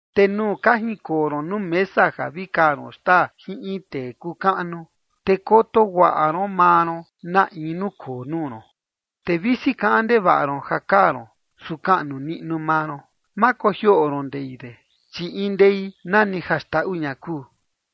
Te nuu ka jinkoo ron nuu mesa ja vi kaa ron xtaa jin in tee kuu kaꞌnu, te koto guaꞌa ron maa ron na in nukoo nuu ron. Te visi kaꞌan ndevaꞌa ron ja kaa ron, su kaꞌnu niꞌnu maa ron. Ma kojioꞌo ron ndei de, chi in ndei nani ja xndaꞌu ña kuu.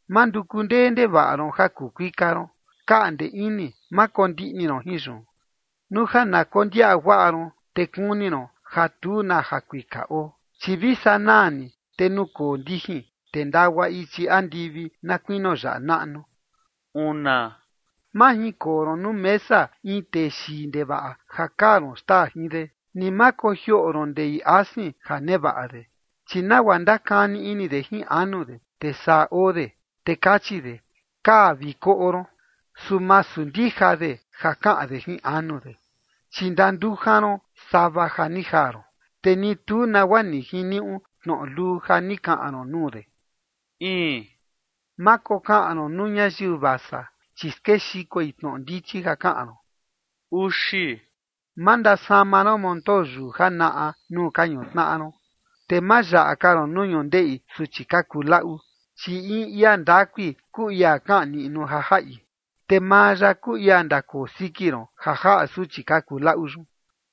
Ma nduku ndee ndevaꞌa ron ja kuu kuika ron, kaꞌnde ini, ma kondiꞌni ron jin yun. Nuu ja na kondiaꞌa guaꞌa ron, te kuni ron ja tu na jakuika oo, chi vi sanaa ni, te nukoo ndijin, te ndagua ichi andivi na kuinio yaꞌa naꞌnu. Ma jinkoo ron nuu mesa in tee xii ndevaꞌa ja kaa ron xtaa jin de, ni ma kojioꞌo ron ndei asin ja nevaꞌa de. Chi nagua ndakani ini de jin anu de, te saa oo de, te kachi de: “Kaa vi koꞌo ron”, su masu ndija de ja kaꞌan de jin anu de. Chi ndandujan ron sava ja ni jaa ron, te ni tu nagua ni jiniuꞌu tnoꞌo luu ja ni kaꞌan ron nuu de. Ma kokaꞌan ron nuu ñayiu vasa, chi skexikoi tnoꞌo ndichi ja kaꞌan ron. Ma ndasama ron montoo yuu janaꞌa nuu ka ñutnaꞌa ron, te ma yaꞌa ka ron nuu ñundeꞌi suchi ka kuu laꞌu. Chi in ia ndakui kuu ia kaꞌan niꞌnu ja jaꞌi, te maa ya kuu ia ndakoo siki ron ja jaꞌa suchi ka kuu laꞌu yun.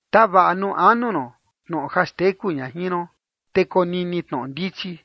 Tavaꞌa nuu anu ron tnoꞌo ja xteku ña jin ron, te konini tnoꞌo ndichi.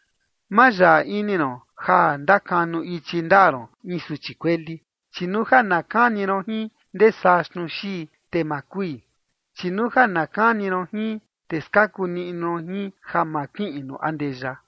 Ma yaꞌa ini ron ja ndakanu ichi ndaa ron in suchi kueli, chi nuu ja na kani ron jin ndesaa xnuu xii, te ma kui. Chi nuu ja na kani ron jin, te skaku niꞌnu ron jin ja ma kiꞌin nuu andeya.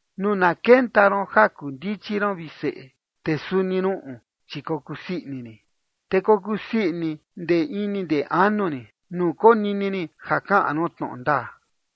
Nuu na kenta ron ja kuu ndichi ron, vi seꞌe, te suni ruꞌun, chi kokuu sii ini rin. Te kokuu sii ini ndee ini ndee anu rin, nuu konini rin ja kaꞌan ron tnoꞌo ndaa.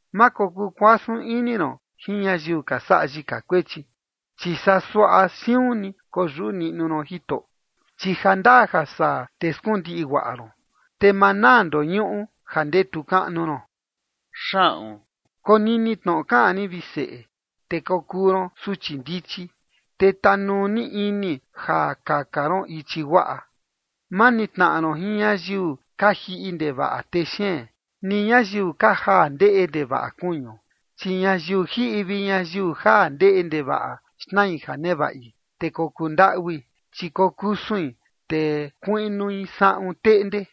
Ma kokuu kuasun ini ron jin ñayiu ka saꞌa yika kuechi, chi saa suaꞌa siun ni koyuꞌu niꞌnu ron Jitoꞌo. Chi jandaa ja saa te skundiꞌi guaꞌa ron, te ma naa ndoñuꞌu ja ndetu kaꞌnu ron. Konini tnoꞌo kaꞌan rin, vi seꞌe, te kokuu ron suchi ndichi, te tanuu ni ini ja kaka ron ichi guaꞌa. Ma nitnaꞌa ron jin ñayiu ka jiꞌi ndevaꞌa texeen, ni ñayiu ka jaa ndeꞌe ndevaꞌa kuñu. Chi ñayiu jiꞌi vi ñayiu jaa ndeꞌe ndevaꞌa xnai ja nevaꞌi, te kokuu ndaꞌui, chi kokusuin, te kuiꞌnui saꞌun teꞌnde.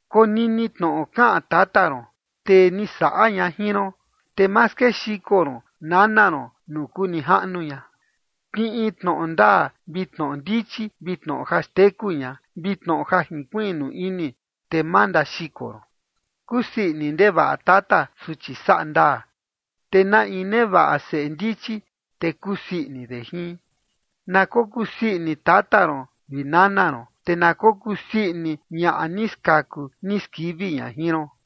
Konini tnoꞌo kaꞌan tata ron, tee ni saꞌa ña jin ron, te ma skexiko ron nana ron nuu kuu nijaꞌnu ña. Kiꞌin tnoꞌo ndaa vi tnoꞌo ndichi vi tnoꞌo ja xteku ña, vi tnoꞌo ja jinkuiꞌnu ini, te ma ndaxiko ron. Kusii ini ndevaꞌa tata suchi saꞌa ndaa, te na in nevaꞌa seꞌe ndichi, te kusii ini de jin. Na kokuu sii ini tata ron vi nana ron, te na kokuu sii ini ñaꞌa ni skaku ni skivi ña jin ron.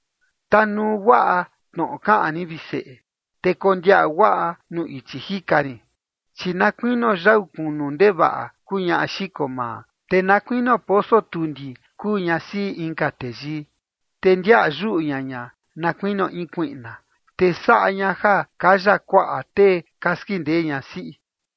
Tanuu guaꞌa tnoꞌo kaꞌan rin, vi seꞌe, te kondiaꞌa guaꞌa nuu ichi jika rin. Chi na kuinio yau kunu ndevaꞌa kuu ñaꞌa xiko maa, te na kuinio poso tundi kuu ñasiꞌi inka teyii. Te ndiaꞌa yuꞌu ña ña, na kuinio in kuiꞌna, te saꞌa ña ja kaya kuaꞌa tee ka skindee ñasiꞌi.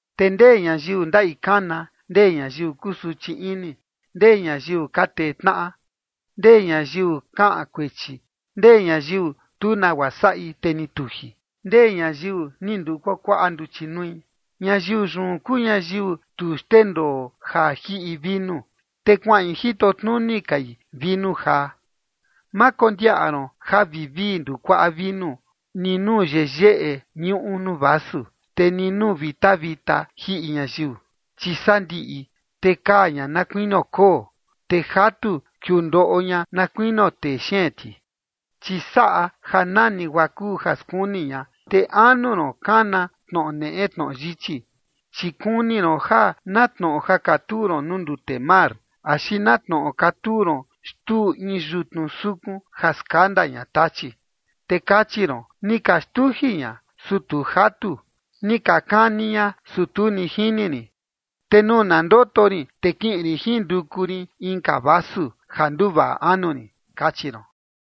¿Te ndee ñayiu ndaꞌi kana? ¿Ndee ñayiu kusuchi ini? ¿Ndee ñayiu ka tee tnaꞌa? ¿Ndee ñayiu kaꞌan kuechi? ¿Ndee ñayiu tu nagua saꞌi, te ni tuji? ¿Ndee ñayiu ni nduu kuakuaꞌa nduchi nui? Ñayiu yun kuu ñayiu tu xndendoo ja jiꞌi vinu, te kuaꞌin jito tnuni kai vinu jaa. Ma kondiaꞌa ron ja vivii ndukuaꞌa vinu ni nuu yeyeꞌe ñuꞌu nuu vasu, te ni nuu vita vita jiꞌi ñayiu. Chi sandiꞌi, te kaa ña na kuinio koo, te jatu kiundoꞌo ña na kuinio texeen ti. Chi saꞌa ja nani guaa kuu ja skuni ña, te anu ron kana tnoꞌo neꞌe tnoꞌo yichi. Chi kuni ron ja na tnoꞌo ja katuu ron nuu ndute mar, axi na tnoꞌo katuu ron xtuu in yutnu sukun ja skanda ña tachi. Te kachi ron: “Ni ka xtuji ña, su tu jatu, ni ka kani ña, su tu ni jini rin, te nuu na ndoto rin, te kiꞌin rin jinduku rin inka vasu ja nduvaꞌa anu rin”, kachi ron.